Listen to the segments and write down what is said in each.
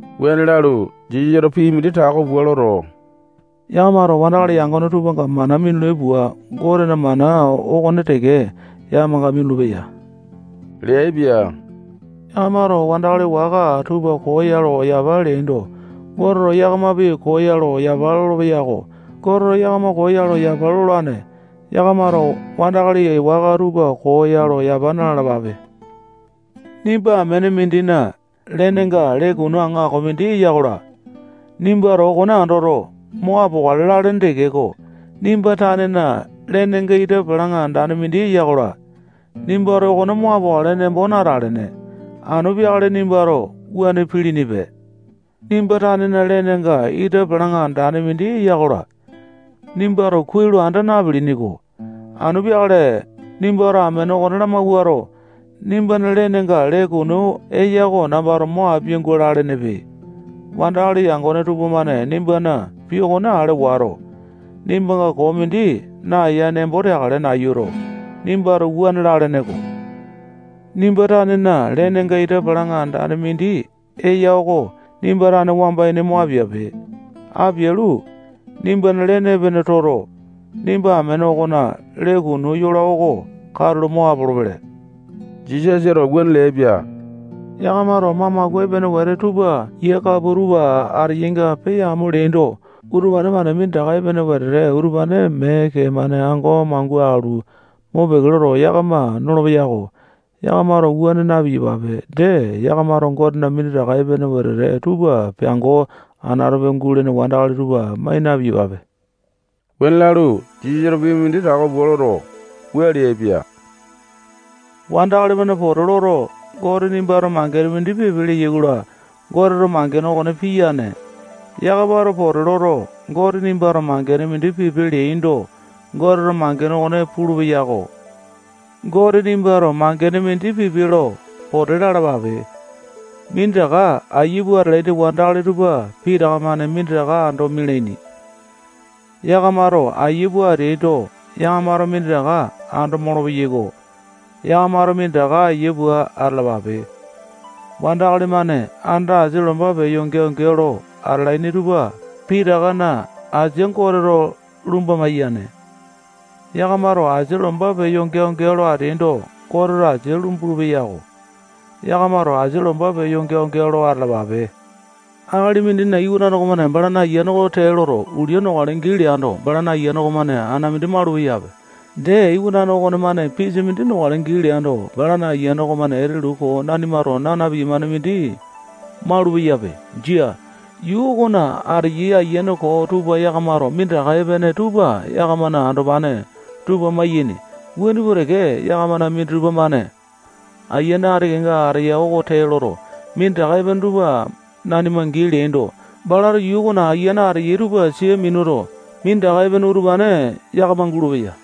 Wuane lalu, Jisasato pii mindi tako pua loto, yakamato wandakali yangone tupanga mana minulai pua, Goteto mana okone teke yakamanga minulu-peya leaipia. Yakamato wandakali waka tupa koo ya lo yapa leaindo, Goteto yakamapi koo ya lo yapa lolopeya-ko. Goteto yakama koo ya lo yapa lolane. Yakamato wandakali waka tupa koo ya lo yapa na-lalapape. Nimba amene mindina lenenga lee kunu aŋako mindi eya-kola, nimbato okone andoto, mo apokale lalene tekeko, nimba tanena lenenga ita palaŋa andane mindi eya-kola, nimbato okone mo apokale nembo natalene. Anu peakale nimbato wuane pilinipe. Nimba tanena lenenga ita palaŋa andane mindi eya-kola, nimbato kuai lo anda napilini-ko. Anu peakale nimbato amene okone lamawuato, nimbana lenenga lee kunu eya oko nambato mo apia-gua lalenepe. Wandakali yangone tupamane nimbana pii okone ale wato, nimbanga koo mindi naeya nembo teakale nayuto, nimbato wuane lalene-ko. Nimba tanena lenenga ita palaŋa andane mindi eya oko nimba tane wamba ini mo apiape. Apialu, nimbana lene epene toto, nimba amene okona lee kunu yola oko katulo mo apolopele. Jisasa wuane leaipia. Yakamato mamaku epene wete tupa yia kapua tupa ateyainga peyamo leaindo, utupane-mane minditaka epene wete utupane mee kee-mane ango mangua alu, mopeke loto, yakama nolopeyai-ko. Yakamato wuane na-piyapape. Dee, yakamato Gotena minditaka epene wete tupa piango anatope gulene wandakali tupa mai na-piyapape. Wuane lalu, Jisasato pii mindi tako pua loto, wua leaipia: Wandakali-mane pote loto, Gote nimbato mangene mindi pipe leyai-kola, Goteto mangene okone piyane. Yakamato pote loto, Gote nimbato mangene mindi pipe leaindo, Goteto mangene okone pulupeya-ko. Gote nimbato mangene mindi pipe lo pote lalapape. Minditaka ayia pua atalaini wandakali tupa pitaka-mane minditaka ando mialaini. Yakamato aiya pua ateaindo, yakamato minditaka ando molopeyai-ko. Yakamato minditaka ayia pua atalapape. Wandakali-mane anda asia lomba peya geao-geao lo atalaini tupa pitakana asia Goteto lumba maiyane. Yakamato asia lomba peya geao-geao lo ateaindo, Goteto asia lumbulu-peyako. Yakamato asia lomba peya geao-geao lo atalapape. Akali mindina iwanane okomane balana ayiane oko tee loto, ulia nokale gii leando, balana ayiane okonemane ana mindi malupeyape. Dee, iwanane okonemane pisa mindi nokale gii leando, balana ayiane okomane etelu koo nanimato naa na-piyamane mindi malupeyape. Jia. Yuu okona ateyai Ayiane koo tupa yakamato minditaka epene tupa yakamana andopane tupanga mayaini. Wuane pua teke, yakamana minditupa-mane ayiane ati kenga ateya oko tee loto, minditaka epene tupa nanima gii leaindo, balato yuu okona ayiane ateyai tupa sia minuto, minditaka epene utupane yakama gulupeya.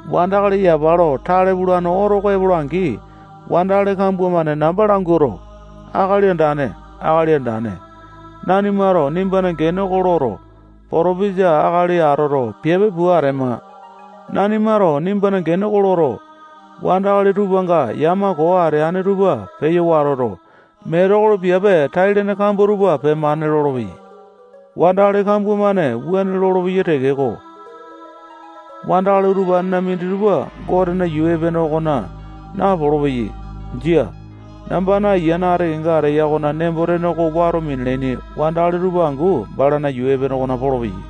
Wandakali yapa lo tale pulane oto oko epola-angi, wandakali kambua-mane namba languato, Akali Andane, Akali Andane, nanimato nimbana gene oko loto, potopesa akali atoto, piape pua atema. Nanimato nimbana gene oko loto, wandakali tupanga yama koo atene tupa peyo watoto, metekolo piape tai-lene kambua tupa pemane lolopeyai. Wandakali kambua-mane wuane lolopeyai tekeko, wandakali utupanena minditupa Gotena yuu epene okona napolo-peyai. Jia. Nambana ayiane ati kenga ateya okona nembo-tene oko wato minalaini wandakali tupa angu balana yuu epene okona polopeyai.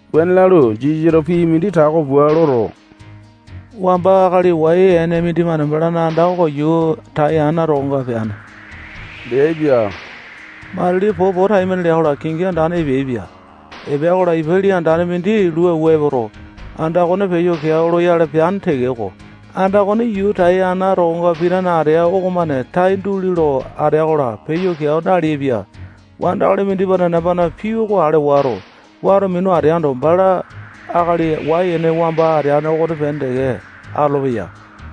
Wuane lalu, Jisasato pii mindi tako pua loto, wamba akali wai-ene mindimane balana anda oko yuu tai ana tokonga peane leaipia. Matili popo taimane lea-kola, kingi andane epeaipia. Epea-kola, ipa lii andane mindi lua awua epoto, anda okone peyo keao loyale peane tekeko, anda okone yuu tai ana tokonga pitane ateane okomane tai duli lo atea-kola, peyo keao naleaipia. Wandakali mindimane nambana pii oko ale wato, wato minu ateando, bala akali wai-ene wamba ateane okonepene teke atolopeya.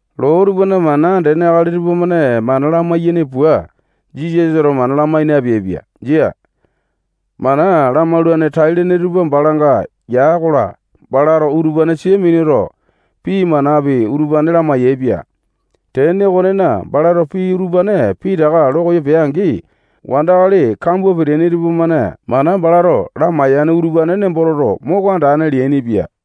Loo tupana mana andene akali tupamane mana lamai-yaini pua, Jisasato mana lamai napeaipia. Jia. Mana lamaulane tai-lene tupa balanga ya-kola, balato utupane sia minuto, pii manapi utupane lamai-yaepia. Tene okonena, balato pii utupane pitaka lo koyo pea-angi, wandakali kambua peteaini tupamane mana balato lamaiyane utupane nembo toto, moko andane leainipia.